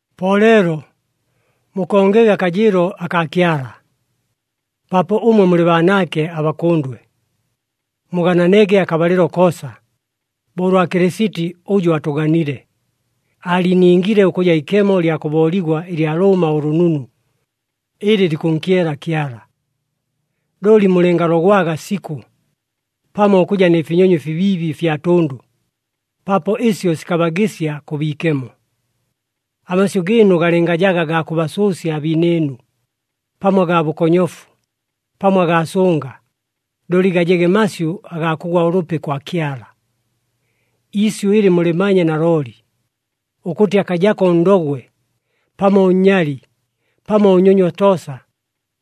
Po leelo mukongege akajɨɨlo akaa Kyala, paapo ʉmwe mulɨ baanaake abakʉndwe. Mugananege akabalɨlo koosa, bo ʉlwa Kɨlɨsiti ʉjʉ atʉganile, aaliiningile ʉkʉja ikemo lya kʉbooligwa ɨlya lʉʉma ʉlʉnunu, ɨlɨ likʉnkyela Kyala. Looli mulɨngalogwaga sikʉ, pamo ʉkʉja nɨ finyonyo ɨfibiibi ɨfya tʉndʉ, paapo ɨsyo sikabagɨsya kʉ biikemo. Amasyʉ gɨɨnu galɨngajaga gaa kʉbasʉʉsya abiinɨɨnu, pamo agaa bʉkonyofu, pamo agaa sʉnga, looli gajege masyʉ agaa kʉgwa ʉlʉpi kwa Kyala. Iisyʉ ɨlɨ mulɨmanye nalooli, ʉkʉtɨ akajako ʉndogwe, pamo ʉnnyali, pamo ʉnnyonywa toosa,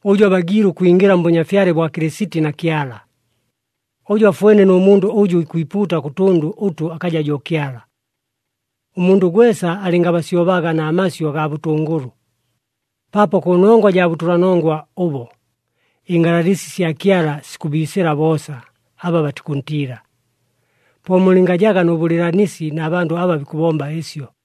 ʉjʉ abagiile ʉkwingɨla mBʉnyafyale bwa Kɨlɨsiti na Kyala. Ʉjo afwene nʉ mundʉ ʉjʉ ikwipuuta kʉ tʉndʉ ʉtʉ akaja jo Kyala. Ʉmundʉ gwesa alɨngabasyobaga na masyʉ agaa bʉtʉngʉlʉ, paapo kʉnongwa jaa bʉtʉlanongwa ʉbo, ɨngalalɨsi sya Kyala sikʉbiisɨla boosa aba batikʉntiila. Po mulɨngajaga nʉ bʉlɨɨlanisi na bandʉ aba bikʉbomba ɨsyo.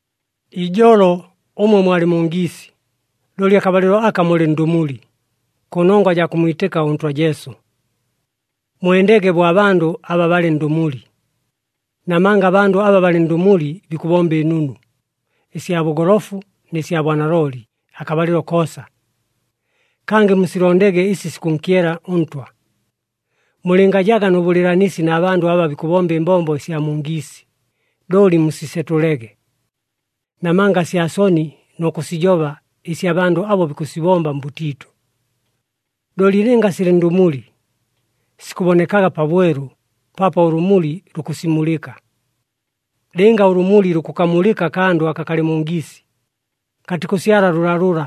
Ijolo ʉmwe mwalɨ mu ngiisi, looli akabalɨlo aka mulɨ ndʉmuli, kʉnongwa jaa kʉmmwitɨka ʉNtwa Jesu. Mwendege bo abandʉ aba balɨ ndʉmuli. Namanga abandʉ aba balɨ ndʉmuli bikʉbomba ɨnunu, ɨsya bʉgolofu nɨ sya bwanalooli, akabalɨlo koosa. Kangɨ musilondege ɨsi sikʉnkyela ʉNtwa. Mulɨngajaga nʉ bʉlɨɨlanisi na bandʉ aba bikʉbomba ɨmbombo ɨsya mu ngiisi, looli musisetʉlege. Namanga sya soni nʉ kʉsijoba ɨsi abandʉ abo bikʉsibomba mbʉtiitʉ. Looli lɨnga silɨ ndʉmuli, sikʉbonekaga pabwelu, paapo ʉlʉmuli lukʉsimulɨka. Lɨnga ʉlʉmuli lukʉkamulɨka akandʉ aka kalɨ mu ngiisi, katikʉsyala lʉlalʉla,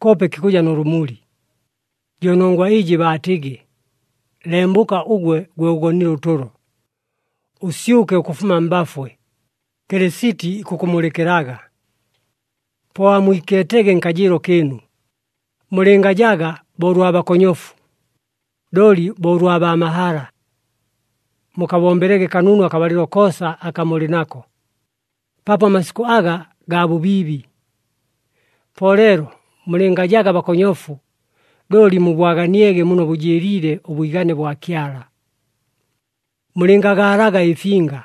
koope kikʉja nʉ lʉmuli. Jo nongwa ɨjɨ baatɨgɨ, “Lembʉka ʉgwe, gwe ʉgonile ʉtʉlo! Ʉsyʉke ʉkʉfuma mbafwe. Kɨlɨsiti ikʉkʉmulɨkɨlaga.” Po amwikeetege nkajɨɨlo kɨɨnu. Mulɨngajaga bo ʉlwa bakonyofu, looli bo ʉlwa baa mahala. Mukabombelege kanunu akabalɨlo koosa aka mulɨ nako, paapo amasikʉ aga gaa bʉbiibi. Po leelo mulɨngajaga bakonyofu, looli mubwaganiege muno bʉjɨɨliile ʉbwigane bwa Kyala. Mulɨngagaalaga ɨfinga,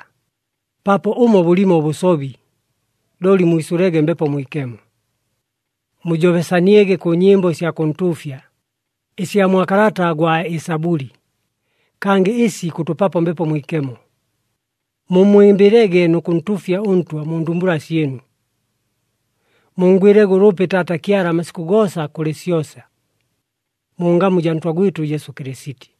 paapo ʉmo bʉlimo ʉbʉsobi, looli mwisʉlege Mbepo Mwikemo. Mujobesaniege kʉ nyɨmbo ɨsya kʉntuufya, ɨsya mwa kalata gwa Ɨsabʉli, kangɨ ɨsi ikʉtʉpapo Mbepo Mwikemo. Mummwɨmbɨlege nʉ kʉntuufya ʉNtwa mu ndumbula syɨnu. Munngwɨlege ʉlʉpi Taata Kyala amasikʉ goosa kʉlɨ syosa, mu ngamu jaa Ntwa gwɨtʉ Jesu Kɨlɨsiti.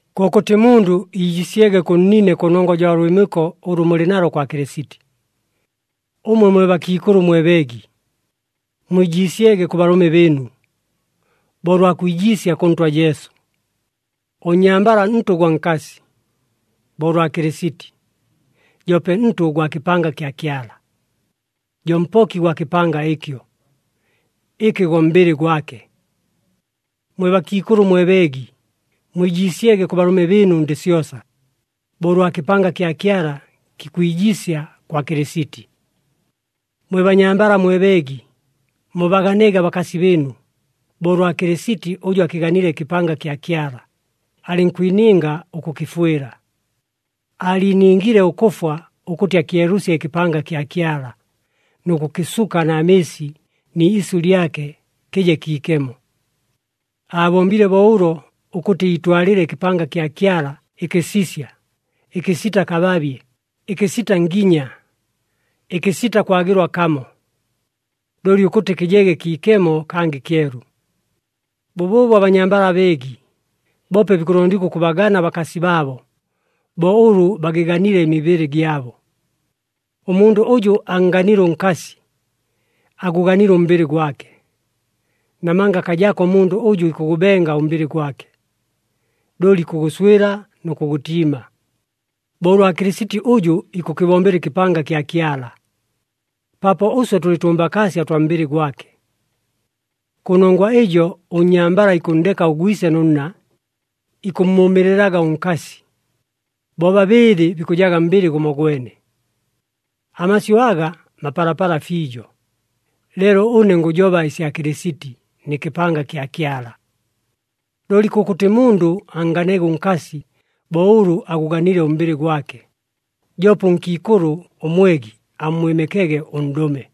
Kʉkʉtɨ mundʉ iijiisyege kʉ nnine kʉnongwa jaa lwɨmɨko ʉlʉ mulɨ nalo kwa Kɨlɨsiti. Ʉmwe mwe bakiikʉlʉ mwe beegi, mwijiisyege kʉ balʉme bɨɨnu, bo ʉlwa kwijiisya kʉ Ntwa Jesu. Ʉnnyambala ntʉ gwa nkasi, bo ʉlwa Kɨlɨsiti, joope ntʉ gwa kɨpanga kya Kyala, jo Mpoki gwa kɨpanga ɨkyo, ɨkɨ go mbɨlɨ gwake. Mwe bakiikʉlʉ mwe beegi, mwijiisyege kʉ balʉme bɨɨnu ndɨ syosa, bo ʉlwa kɨpanga kya Kyala kikwijiisya kwa Kɨlɨsiti. Mwe banyambala mwe beegi, mubaganege abakasi bɨɨnu, bo ʉlwa Kɨlɨsiti ʉjʉ akɨganile ɨkɨpanga kya Kyala, alɨnkwininga ʉkʉkɨfwɨla. Aaliiningile ʉkʉfwa ʉkʉtɨ akyelʉsye ɨkɨpanga kya Kyala, nʉ kʉkɨsuka na mɨɨsi ni isyʉ lyake, kɨje kiikemo. Aabombile bo ʉlo ʉkʉtɨ iitwalɨle ɨkɨpanga kya Kyala ɨkɨsisya, ɨkɨsita kababye, ɨkɨsita nginya, ɨkɨsita kwagɨlwa kamo. Looli ʉkʉtɨ kɨjege kiikemo kangɨ kyelu. Bʉbʉʉbo abanyambala abeegi, boope bikʉlondigwa ʉkʉbagana abakasi baabo, bo ʉlʉ bagɨganile ɨmibɨlɨ gyabo. Ʉmundʉ ʉjʉ annganile ʉnkasi, agʉganile ʉmbɨlɨ gwake. Namanga akajako ʉmundʉ ʉjʉ ikʉgʉbenga ʉmbɨlɨ gwake, looli ikʉgʉswɨla nʉ kʉgʉtiima, bo ʉlwa Kɨlɨsiti ʉjʉ ikʉkɨbombela ɨkɨpanga kya Kyala, paapo ʉswe tʉlɨ tʉmbakaasya ʉtwa mbɨlɨ gwake. “Kʉnongwa ɨjo ʉnnyambala ikʉnndeka ʉgwise nʉ nna, ikʉmmʉʉmɨɨlɨlaga ʉnkasi, bobabɨɨlɨ bikʉjaga mbɨlɨ gʉmogwene.” Amasyʉ aga mapalapala fiijo, leelo ʉne ngʉjoba ɨsya Kɨlɨsiti, nɨ kɨpanga kya Kyala. Looli kʉkʉtɨ mundʉ annganege ʉnkasi bo ʉlʉ agʉganile ʉmbɨlɨ gwake, joope ʉnkiikʉlʉ ʉmwegi ammwɨmɨkege ʉndʉme.